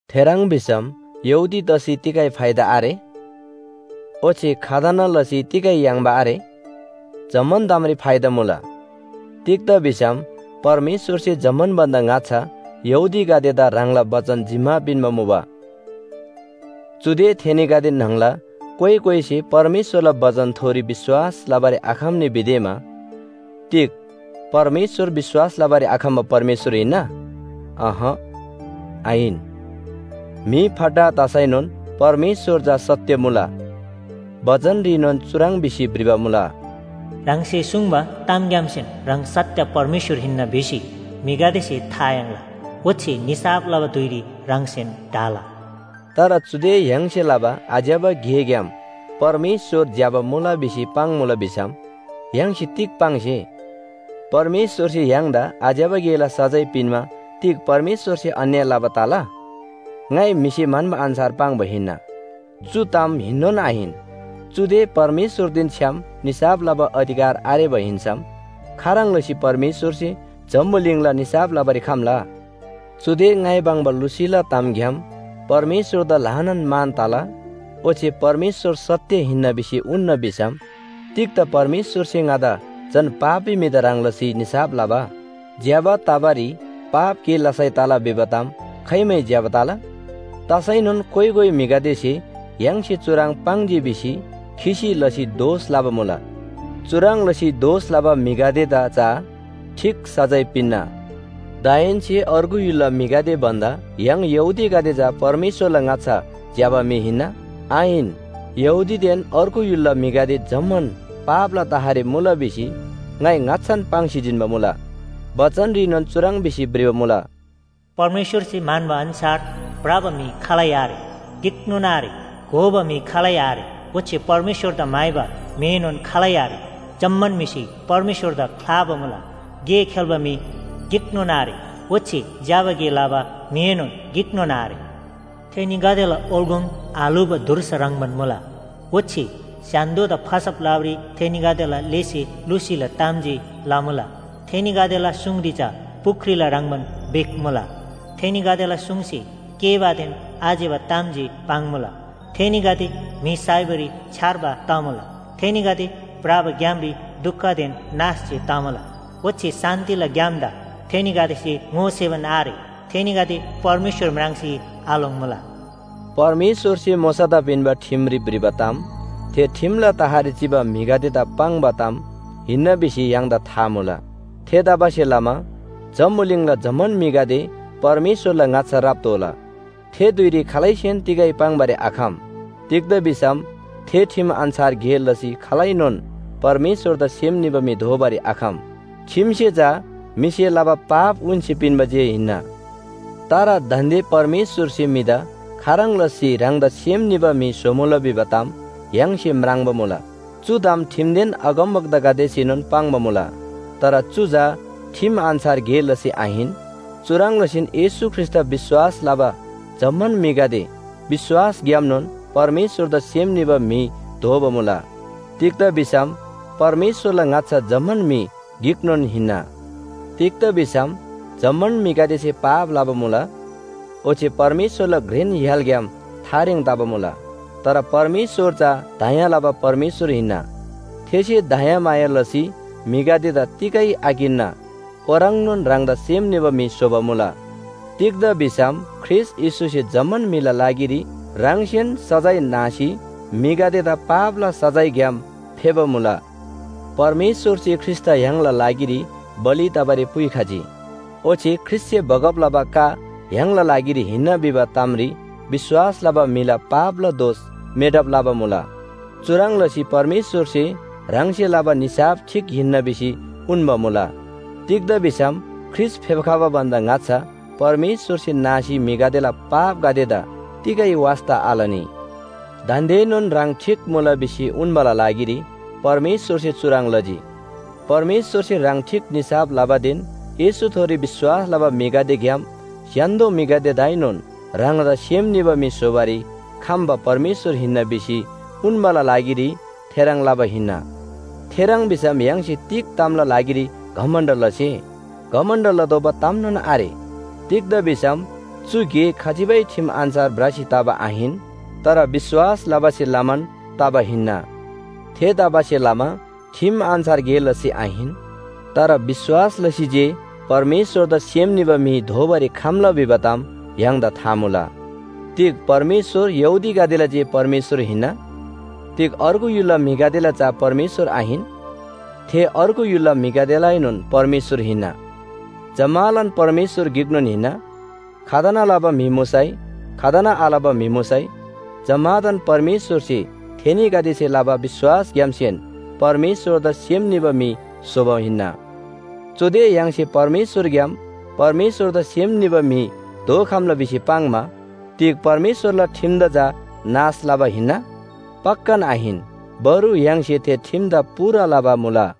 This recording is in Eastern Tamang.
थेह्रङ् भिसम यहूदी तसी तिगै फाइदा आरे? ओच्‍छे खतना लसी तिगै याङ्बा आरे? जम्‍मान तामरी फाइदा मुला। तिग्‍दा भिसम परमेश्‍वरसे जम्‍मान भन्‍दा ङाच्‍छा यहूदीगदेदा ह्राङला बचन जिम्‍मा पिन्‍बा मुबा। चुदे थेनीगदे न्‍हङला कोइ कोइसे परमेश्‍वरला बचनथोरी विश्‍वास लबारी आखम्‍नी भिदेमा तिग परमेश्‍वर विश्‍वास लबारी आखम्‍बा परमेश्‍वर हिन्‍ना? अहँ, आहिन। म्‍हि फट्टा तसैनोन परमेश्‍वर चा सत्‍य मुला। बचनरीनोन चुह्रङ् भिसी भ्रिबा मुला, “ह्राङसे सुङ्बा तामग्‍यामसेन ह्राङ सत्‍य परमेश्‍वर हिन्‍ना भिसी म्‍हिगदेसे था याङ्ला, ओच्‍छे निसाफ लबा धुइरी ह्राङसेन ढाला।” तर चुदे य्‍हाङसे लबा आज्‍यबा गेग्‍याम परमेश्‍वर ज्‍यबा मुला भिसी पाङ्‌मुला भिसम य्‍हाङसे तिग पाङ्से? परमेश्‍वरसे य्‍हाङदा आज्‍यबा गेला सजाय पिन्‍मा तिग परमेश्‍वरसे अन्‍याय लबा तला? ङाइ म्‍हिसे म्‍हन्‍बा अन्‍छार पाङ्बा हिन्‍ना। चु ताम हिन्‍नोन आहिन, चुदे परमेश्‍वरदेन छ्‌याम निसाफ लबा अधिकार आरेबा हिन्‍सम खाह्रङ् लसी परमेश्‍वरसे जम्‍बुलिङला निसाफ लबारी खम्‍ला? चुदे ङाइ पाङ्बा लुसीला तामग्‍याम परमेश्‍वरदा ल्‍हानान मान तला, ओच्‍छे परमेश्‍वर सत्‍य हिन्‍ना भिसी उन्‍ना भिसम तिग्‍दा परमेश्‍वरसे ङादा झन पापी म्‍हिदा ह्रङ् लसी निसाफ लबा? ज्‍यबा तबारी पाप गे लसै तला भिबा ताम खाइमै ज्‍यबा तला? तसैनोन कोइ कोइ म्‍हिगदेसे य्‍हाङसे चुह्रङ् पाङ्जी भिसी खिसी लसी दोष लबा मुला। चुह्रङ् लसी दोष लबा म्‍हिगदेदा चा ठीक सजाय पिन्‍ना। दाहेन्‍से अर्गु य्‍हुलला म्‍हिगदे भन्‍दा य्‍हाङ यहूदीगदे चा परमेश्‍वरला ङाच्‍छा ज्‍यबा म्‍हि हिन्‍ना? आहिन। यहूदीदेन अर्गु य्‍हुलला म्‍हिगदे जम्‍मान पापला तहरी मुला भिसी ङाइ ङाच्‍छान पाङ्सी जिन्‍बा मुला। बचनरीनोन चुह्रङ् भिसी भ्रिबा मुला “परमेश्‍वरसे म्‍हन्‍बा अन्‍छार भ्रबा म्‍हि खालै आरे, गिकनोन आरे। घोबा म्‍हि खालै आरे, ओच्‍छे परमेश्‍वरदा म्‍हाइबा म्‍हिएनोन खालै आरे। जम्‍मान म्‍हिसे परमेश्‍वरदा ख्‍लाबा मुला, गे खेल्‍बा म्‍हि गिकनोन आरे, ओच्‍छे ज्‍यबा गे लबा म्‍हिएनोन गिकनोन आरे। थेनीगदेला ओल्‍गोङ आल्‍हुबा धुर्सा ह्रङ्‌बान मुला, ओच्‍छे स्‍य्‍हान्‍दोदा फसब लबारी थेनीगदेला लेसे लुसीला ताम जे लमुला। थेनीगदेला सुङरी चा पुख्रीला ह्रङ्‌बान बिख मुला। थेनीगदेला सुङसे केःबादेन आज्‍यबा ताम जे पाङ्‌मुला। थेनीगदे म्‍हि साइबारी छ्‌यार्बा तमुला। थेनीगदे भ्रबा ग्‍यामरी दुखदेन नाश जे तमुला। ओच्‍छे शान्‍तिला ग्‍यामदा थेनीगदेसे ङोसेबान आरे। थेनीगदे परमेश्‍वर म्राङ्सी आलोङ्‍मुला।” परमेश्‍वरसे मोशादा पिन्‍बा ठिमरी भ्रिबा ताम थे ठिमला तहरी चिबा म्‍हिगदेदा पाङ्बा ताम हिन्‍ना भिसी य्‍हाङदा था मुला। थेतबासेलमा जम्‍बुलिङला जम्‍मान म्‍हिगदे परमेश्‍वरला ङाच्‍छा राप्‍तोःला। थे धुइरी खालैसेन तिगै पाङ्‌बारी आखम। तिग्‍दा भिसम थे ठिम अन्‍छार गे लसी खालैनोन परमेश्‍वरदा सेम निबा म्‍हि दोबारी आखम। ठिमसे चा म्‍हिसे लबा पाप उन्‍सी पिन्‍बा जे हिन्‍ना। तर दान्‍दे परमेश्‍वरसे म्‍हिदा खाह्रङ् लसी ह्राङदा सेम निबा म्‍हि स्‍होमुला भिबा ताम य्‍हाङसे म्राङ्बा मुला। चु ताम ठिमदेन अगमवक्तागदेसेनोन पाङ्बा मुला। तर चु चा ठिम अन्‍छार गे लसी आहिन। चुह्रङ् लसीन येशू ख्रीष्‍टदा विश्‍वास लबा जम्‍मान म्‍हिगदे विश्‍वासग्‍यामनोन परमेश्‍वरदा सेम निबा म्‍हि दोबा मुला। तिग्‍दा भिसम परमेश्‍वरला ङाच्‍छा जम्‍मान म्‍हि गिकनोन हिन्‍ना। तिग्‍दा भिसम जम्‍मान म्‍हिगदेसे पाप लबा मुला, ओच्‍छे परमेश्‍वरला घ्रेन य्‍हालग्‍याम थारेङ तबा मुला। तर परमेश्‍वर चा दया लबा परमेश्‍वर हिन्‍ना, थेसे दयामाया लसी म्‍हिगदेदा तिगै आकिन्‍ना ओह्रङ्नोन ह्राङदा सेम निबा म्‍हि स्‍होबा मुला। तिग्‍दा भिसम ख्रीष्‍ट येशूसे जम्‍मान म्‍हिला लागिरी ह्राङसेन सजाय नासी म्‍हिगदेदा पापला सजायग्‍याम फेबा मुला। परमेश्‍वरसे ख्रीष्‍टदा य्‍हाङला लागिरी बलि तबारी पुइखजी। ओच्‍छे ख्रीष्‍टसे बगब लबा का य्‍हाङला लागिरी हिन्‍ना भिबा तामरी विश्‍वास लबा म्‍हिला पापला दोष मेटब लबा मुला। चुह्रङ् लसी परमेश्‍वरसे ह्राङसे लबा निसाफ ठीक हिन्‍ना भिसी उन्‍बा मुला। तिग्‍दा भिसम ख्रीष्‍ट फेप्‍खबा भन्‍दा ङाच्‍छा परमेश्‍वरसे नासी म्‍हिगदेला पापगदेदा तिगै वास्‍ता आलनी। दान्‍देनोन ह्राङ ठीक मुला भिसी उन्‍बाला लागिरी परमेश्‍वरसे चुह्रङ् लजी। परमेश्‍वरसे ह्राङ ठीक निसाफ लबादेन येशूथोरी विश्‍वास लबा म्‍हिगदेग्‍याम स्‍य्‍हान्‍दो म्‍हिगदेदाएनोन ह्राङदा सेम निबा म्‍हि स्‍होबारी खम्‍बा परमेश्‍वर हिन्‍ना भिसी उन्‍बाला लागिरी थेह्रङ् लबा हिन्‍ना। थेह्रङ् भिसम य्‍हाङसे तिग तामला लागिरी घमण्‍ड लसे? घमण्‍ड लतोःबा तामनोन आरे। तिग्‍दा भिसम चु गे खजिबै ठिम अन्‍छार भ्रसी तबा आहिन। तर विश्‍वास लबासे लमान तबा हिन्‍ना। थेतबासेलमा ठिम अन्‍छार गे लसी आहिन। तर विश्‍वास लसी जे परमेश्‍वरदा सेम निबा म्‍हि दोबारी खम्‍ला भिबा ताम य्‍हाङदा था मुला। तिग परमेश्‍वर यहूदीगदेला जे परमेश्‍वर हिन्‍ना? तिग अर्गु य्‍हुलला म्‍हिगदेला चा परमेश्‍वर आहिन? थे अर्गु य्‍हुलला म्‍हिगदेलाएनोन परमेश्‍वर हिन्‍ना। जम्‍मालान परमेश्‍वर गिकनोन हिन्‍ना। खतना लबा म्‍हि मुसै, खतना आलबा म्‍हि मुसै, जम्‍मादान परमेश्‍वरसे थेनीगदेसे लबा विश्‍वासग्‍यामसेन परमेश्‍वरदा सेम निबा म्‍हि स्‍होबा हिन्‍ना। चुदे य्‍हाङसे विश्‍वासग्‍याम परमेश्‍वरदा सेम निबा म्‍हि दोखम्‍ला भिसी पाङ्‌मा तिग परमेश्‍वरला ठिमदा चा नाश लबा हिन्‍ना? पक्‍कान आहिन, बरु य्‍हाङसे थे ठिमदा पूरा लबा मुला।